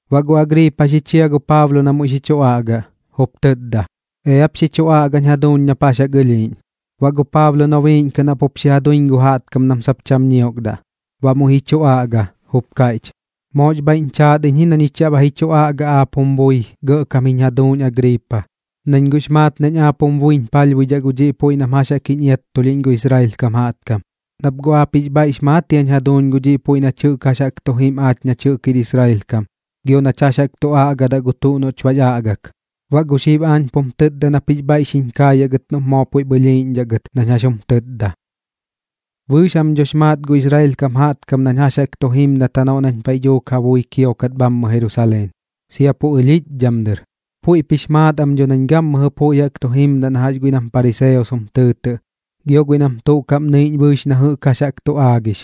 Baꞌ gu Agriipa xi chia gu Paablo na muiꞌ xi chu aꞌgaꞌ, jup tɨtda: ―Eap xi chu aꞌgañ jaduuñ nap jax jaꞌk ɨlhiiꞌñ. Baꞌ gu Paablo nobiiꞌñ kɨꞌn jaꞌp xi ja duiñ gu jaꞌtkam nam sap cham ñiokdaꞌ, baꞌ muiꞌ ji chu aꞌga, jup kaiꞌch: ―Moox bhaiꞌñ chaat iñ na ñich yaꞌ ba ji chu aꞌga aap jum bui gɇꞌkam jiñ jaduuñ Agriipa, nañ guꞌx maat nañ aap jum buiñ palhbuidhaꞌ gu dhiꞌ puiꞌ nam jax jaꞌk jiñ iattulhiꞌñ gu Israel kam jaꞌtkam. Nap guꞌ aap jix bhaiꞌx maat jiañ jaduuñ gu dhiꞌ puiꞌ nach jɨꞌk jax jaꞌk tu jim aach nach jir Israel kam jaꞌtkam gio nach jax jaꞌk tu aꞌgadaꞌ gu tuꞌ noꞌch bax aꞌgak. Baꞌ gu xib aañ pum tɨtda nap jix bhaiꞌ ka xiñ kaayaꞌ gɨt noꞌp moo puiꞌp ɨlhiiꞌñdhaꞌ gɨt nañ jax jum tɨɨdaꞌ. ’Bɨɨx jam dhox maat gu Israel kam jaꞌtkam nañ jax jaꞌk tu jimdat janoꞌ nañ paiꞌ dhuuk ja bui kiokat bhammɨ Jerusaleen, sia gu pu ɨlhiꞌchdham dɨr. Puiꞌp jix maat am dho nañ gammɨjɨ puiꞌ jaꞌk tu jimdaꞌ na jax guiꞌ nam pariseos jum tɨɨtɨꞌ, guiꞌ nam tuꞌ kaꞌm nɨiꞌñ bɨɨx na jɨꞌk jax jaꞌk tu aagix.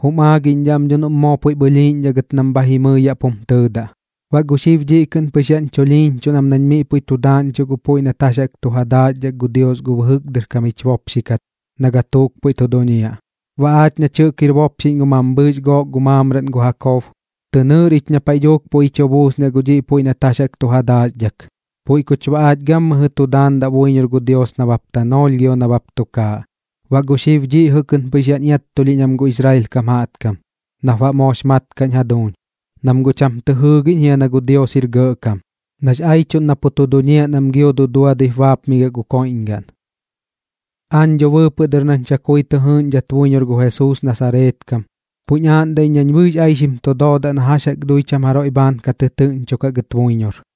Jum aagiꞌñdhaꞌ am dho noꞌm moo puiꞌp ɨlhiiꞌñdhaꞌ gɨt nam bha jimɨi yaꞌ pum tɨɨdaꞌ. Baꞌ gu xib dhiꞌ kɨꞌn pɨx yaꞌñ chulhiiñchuꞌn am nañ miꞌ puiꞌ tu daaꞌñchuꞌ gu puiꞌ nat jax jaꞌk tu ja daaxdhak gu Dios gu bɨjɨk dɨr kam jich bopxi kat na gatuuk pu tu duñiaꞌ. Baꞌ aach nach jɨꞌk jir bopxiꞌñ gu mambhɨɨx gook maamraꞌn gu Jakob, tɨ nɨɨr ich na paiꞌ dhuuk puiꞌ ji chu buusniaꞌ gu dhiꞌ puiꞌ nat jax jaꞌk tu ja daaxdhak, puiꞌ kuch baꞌ aach gammɨjɨ tu daandaꞌ buiñor gu Dios nabap tanoolh gio nabap tukaaꞌ. Baꞌ gu xib dhiꞌ jɨꞌ kɨꞌn pɨx yaꞌñ iattulhiꞌñ am gu Israel kam jaꞌtkam, nap baꞌ moox mat kaꞌñ jaduuñ, nam guꞌ cham tɨ jɨɨgiꞌñ jia na gu Dios jir gɇꞌkam, nax aiꞌchuꞌn na pu tu duñiaꞌ nam gio duduadɨip baapmigiaꞌ gu koiꞌñgaꞌn. ’Aañ dho bɨɨpɨꞌ dɨr nañ chakui tɨ jɨɨꞌñdhat buiñor gu Jesuus Nasareet kam, puiꞌñ aaꞌndaꞌ iñ nañ bɨɨx aixim tu doodaꞌ na jax jaꞌk dui cham jaroiꞌ bhaan ka tɨtɨɨꞌñchukaꞌ gɨt buiñor.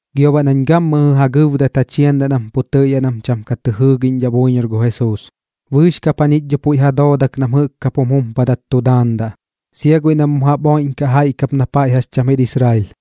Gio baꞌ nañ gammɨjɨ ja gɨbdat ja chiandaꞌ nam pu tɨꞌyaꞌ nam cham tuꞌ ka tɨ jɨɨgiꞌñdhaꞌ buiñor gu Jesuus. Bɨɨx kap jañich dho guꞌ puiꞌ ja dooda nam jɨꞌk kap jum jumpadat tu daandaꞌ, sia guiꞌ nam mu jaꞌp oiꞌdhaꞌkaꞌ jaiꞌ kap na paiꞌ jax cham jir Israel.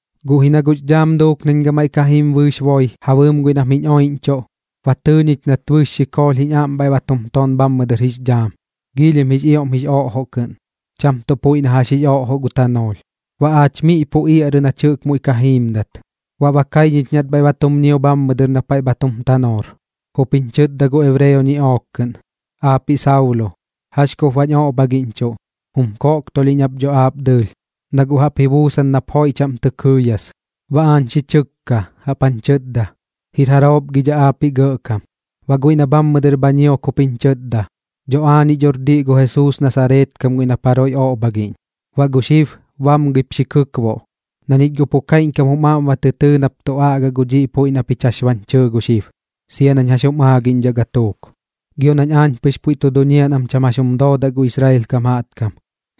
Guꞌ ji na guꞌx dhaam duuk nañ gamaiꞌ ka jim gu bɨɨx boi ja bɨɨm guiꞌ nam jiñ oiꞌñchuꞌ, ba tɨɨ ñich nat bɨɨx xikoolh jich aꞌm bhaiꞌ ba tum ton bhammɨ dɨr jix dhaam giilhim jix ioꞌm jix oꞌjoꞌ kɨꞌn, cham tuꞌ puiꞌ na jax jix oꞌjoꞌ gu tanoolh. Baꞌ aach miꞌ pu iaꞌrɨ bɨɨx nach jɨꞌk muiꞌ ka jiimdat, baꞌ ba kai ñich nat bhaiꞌ ba tum ñio bhammɨ dɨr na paiꞌ bha tum tanoor, jup jiñ chɨtda gu ebreo ñiꞌook kɨꞌn: “Aapiꞌ Saulo, ¿jax kup baꞌñ oꞌbhagiꞌñchuꞌ? Jum koꞌktulhiꞌñ ap dho aap dɨɨlh, na guꞌ jaꞌp ji buusan nap joiꞌ chaꞌm tɨ kɨɨyas.” Baꞌ aañ xi chɨkka, jaꞌp jañ chɨtda: “¿Jir jaroop gi dhaꞌ aapiꞌ Gɇꞌkam?” Baꞌ guiꞌ na bhammɨ dɨr bha ñiok jup jiñ chɨtda: “Dho aañiꞌ dhor diꞌ gu Jesuus Nasareet kam guiꞌ nap jaroiꞌ oꞌbhagiꞌñ. Baꞌ gu xib bamgɨip xi kɨkboꞌ, na ñich guꞌ pu kaiꞌñkam jum aꞌm ba tɨ tɨɨ nap tu aꞌgaꞌ gu dhiꞌ puiꞌ na pich jax bañ chɨɨ gu xib, sia nañ jax jum aagiꞌñdhaꞌ gatuuk. Gio nañ aañ pɨx puiꞌ tu duñiaꞌ nam cham jax jum doodaꞌ gu Israel kam jaꞌtkam,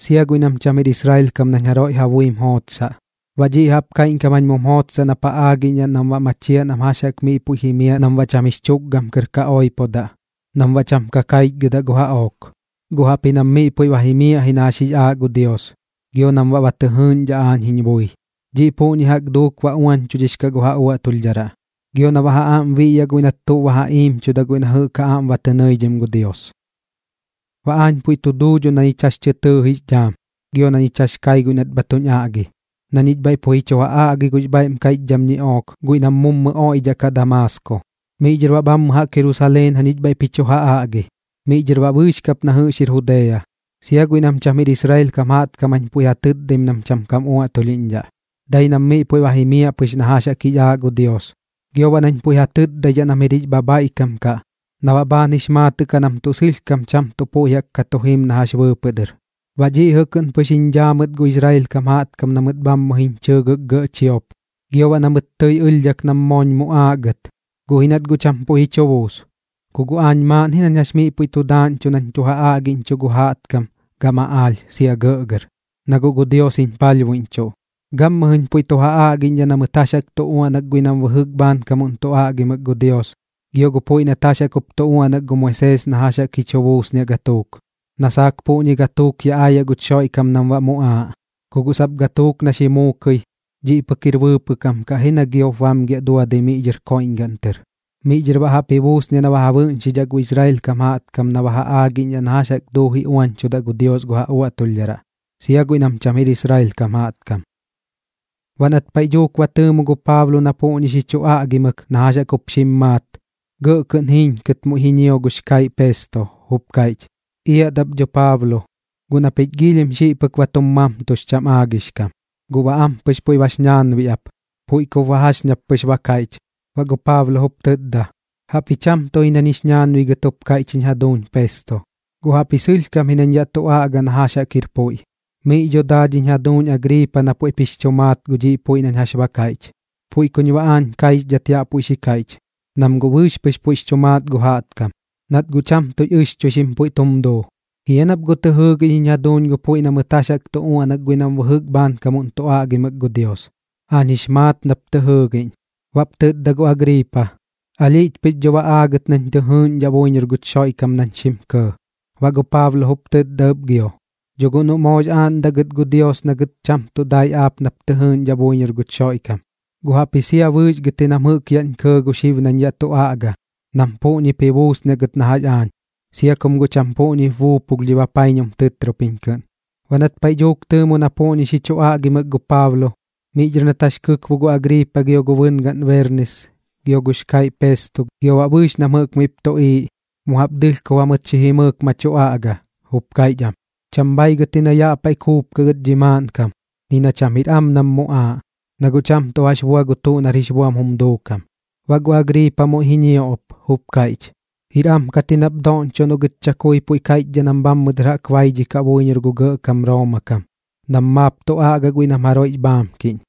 sia guiꞌ nam cham jir Israel kam nañ jaroiꞌ ja buim jootsaꞌ. Baꞌ dhiꞌ jaꞌp kaiꞌñkam jañ mum jootsaꞌ nap ja aagiꞌñdhaꞌ nam baꞌ ba machiaꞌ nam jax jaꞌk miꞌ puiꞌ jimiaꞌ nam baꞌ cham jix chu tukgam kɨr ka oipodaꞌ, nam baꞌ cham ka kaichgɨdaꞌ gu jaꞌook. Guꞌ jaꞌpji nam miꞌ puiꞌ ba jimiaꞌ ji na jax jix aaꞌ gu Dios, gio nam baꞌ ba tɨ jɨɨꞌñdhaꞌ aañ jiñ bui. Dhiꞌ puꞌñi jaꞌk duuk baꞌ ba uañchudhix kaꞌ gu ja uaꞌtulhdharaꞌ, gio na baꞌ ja aꞌm biꞌyaꞌ guiꞌ nat tuꞌ ba ja iimchuda guiꞌ na jɨꞌk ja aꞌm ba tɨ nɨidhim gu Dios.” ’Baꞌ aañ puiꞌ tu duu dho na ñich jax jaꞌk tɨ tɨɨx dhaam gio na ñich jax jaꞌk kai guiꞌ nat bha tuñ aꞌgi, na ñich bhaiꞌ pu ji chu ja aꞌgi gux bhaiꞌm kaiꞌchdham ñiꞌook guiꞌ nam mummɨ oiꞌdhaꞌkaꞌ Damaasko. Miꞌ dhɨr baꞌ bhammɨ jaꞌk Jerusaleen jañich bhaiꞌp ji chu ja aꞌgi, miꞌ dhɨr baꞌ bɨɨx kap na jɨꞌx jir Judea. Sia guiꞌ nam cham jir Israel kam jaꞌtkam jañ puiꞌ ja tɨtdaim nam cham kam uaꞌtulhiꞌñdhaꞌ, dai nam miꞌ puiꞌ ba jimiaꞌ pɨx na jax jix aaꞌ gu Dios, gio baꞌ nañ puiꞌ ja tɨtdaidhaꞌ nam jir jix bhabhaiꞌkam kaꞌ na baꞌ bhaan jix maatɨꞌ kaꞌ nam tuꞌ sɨlhkam cham tuꞌ puiꞌ jaꞌk ka tu jim na jax bɨɨpɨꞌ dɨr. Baꞌ dhiꞌ jɨꞌ kɨꞌn pɨx jiñ dhaa mɨt gu Israel kam jaꞌtkam na mɨt bhammɨ jiñ chɨɨgɨk gɇꞌ chiop, gio baꞌ na mɨt tɨi ɨlhdhak nam mooñ muꞌaaꞌ gɨt, guꞌ ji nat guꞌ cham puiꞌ ji chu buus. Ku guꞌ aañ maaꞌn ji nañ jax miꞌ puiꞌ tu daaꞌñchuꞌ nañ tu ja aꞌgiꞌñchuꞌ gu jaꞌtkam gam aꞌaalh sia gɇꞌgɇr, na guꞌ gu Dios jiñ palhbuiꞌñchuꞌ. Gammɨjɨñ puiꞌ tu ja aꞌgiꞌñdhaꞌ na mɨt jax jaꞌk tu uaꞌnak guiꞌ nam bɨjɨk bhaankam tu aꞌgimɨk gu Dios gio gu puiꞌ nat jax jaꞌk jup tu uaꞌnak gu Moisees na jax jaꞌk ji chu buusniaꞌ gatuuk, na saak puꞌñi gatuuk yaꞌ aayaꞌ guch Xoiꞌkam nam baꞌ muꞌaaꞌ, ku guꞌ sap gatuuk na xi muukɨi, dhiꞌ pɨk jir bɨɨpɨꞌ kam kaꞌ ji na giop bamgiaꞌ duadɨi miꞌ dhɨr koiꞌñgaꞌn tɨr. Miꞌ dhɨr baꞌ jaꞌp ji buusniaꞌ na ja bɨꞌñxidhaꞌ gu Israel kam jaꞌtkam na ba ja aagiꞌñdhaꞌ na jax jaꞌk duuji uañchudaꞌ gu Dios gu ja uaꞌtulhdharaꞌ, sia guiꞌ nam cham jir Israel kam jaꞌtkam. Baꞌ nat paiꞌ dhuuk ba tɨɨmu gu Paablo na puꞌñi xi chu aꞌgimɨk na jax jaꞌk jup xim maat, gɇꞌ kɨꞌn jiiñkɨt muiꞌ ji ñio gux kaiꞌ Pesto, jup kaiꞌch: ―¡Iat ap dho Paablo! Guꞌ na pich giilhim xiꞌ pɨk ba tum mamtux cham aagix kam. Guꞌ baꞌ ampɨx puiꞌ bax ñaanbiꞌ ap, puiꞌ kup baꞌ jax ñap pɨx ba kaiꞌch. Baꞌ gu Paablo jup tɨtda: ―Jaꞌpji cham tuꞌ ji nañ jix ñaanbigɨt jup kaiꞌch jiñ jaduuñ Pesto, guꞌ jaꞌpji sɨlhkam ji nañ yaꞌ tu aꞌga na jax jaꞌk jir puiꞌ. Miꞌñi dho daa dhiñ jaduuñ Agriipa na puiꞌp jix chu maat gu dhiꞌ puiꞌ nañ jax ba kaiꞌch. Puiꞌ kuñ baꞌ aañ kaixdhat yaꞌ puiꞌ xi kaiꞌch, nam guꞌ bɨɨx pɨx puiꞌx chu maat gu jaꞌtkam, nat guꞌ cham tuꞌx ɨxchuixim puiꞌ tum duu. ¿Jia nap guꞌ tɨ jɨɨgiꞌñ jiñ jaduuñ gu puiꞌ na mɨt jax jaꞌk tu uaꞌnak guiꞌ nam bɨjɨk bhaankam tu aꞌgimɨk gu Dios? Aañ jix maat nap tɨ jɨɨgiꞌñ. Baꞌp tɨtda gu Agriipa: ―Alhiꞌch pɨx dho ba aagɨt nañ tɨ jɨɨꞌñdhaꞌ buiñor guch Xoiꞌkam nañ xim kɇɇ. Baꞌ gu Paablo jup tɨtda ɨp gio: ―Dho guꞌ noꞌ moox aaꞌndaꞌ gɨt gu Dios na gɨt cham tuꞌ dai aap nap tɨ jɨɨꞌñdhaꞌ buiñor guch Xoiꞌkam, guꞌ jaꞌpji sia bɨɨx gɨt ji nam jɨꞌk yaꞌñ kɇɇ gu xib nañ yaꞌ tu aꞌga nam puꞌñip ji buusniaꞌ gɨt na jax aañ, sia kum guꞌ cham puꞌñi buupulh dhi bapaiñum tɨtropiñ kɨꞌn. Baꞌ nat paiꞌ dhuuk tɨɨmu na puꞌñi xi chu aꞌgimɨk gu Paablo, miꞌ dhɨr nat jax kɨkbo gu Agriipa gio gu bɨngaꞌn Berniis gio gux kaiꞌ Pesto gio baꞌ bɨɨx nam jɨꞌk miꞌp tuꞌiiꞌ, mu jaꞌp dɨlhkob jamɨt xi jimɨɨk ma tu aꞌga, jup kaiꞌch am: ―Cham bhaigɨt ji na yaꞌ paiꞌ kuupkaꞌ gɨt dhi maaꞌnkam, ni na cham jir am nam muꞌaaꞌ, na guꞌ cham tuꞌ jax bua gu tuꞌ nar jix buam jum duukam. Baꞌ gu Agriipa muiꞌ ji ñio ɨp, jup kaiꞌch: ―Jir am kat ji nap doꞌñchoꞌ noꞌ gɨt chakui pu kaiꞌchdhaꞌ nam bhammɨ dɨr jaꞌk baidhikaꞌ buiñor gu gɇꞌkam Rooma kam nam puiꞌ maap tu aꞌgaꞌ guiꞌ nam jaroiꞌx bhaamkiꞌñ.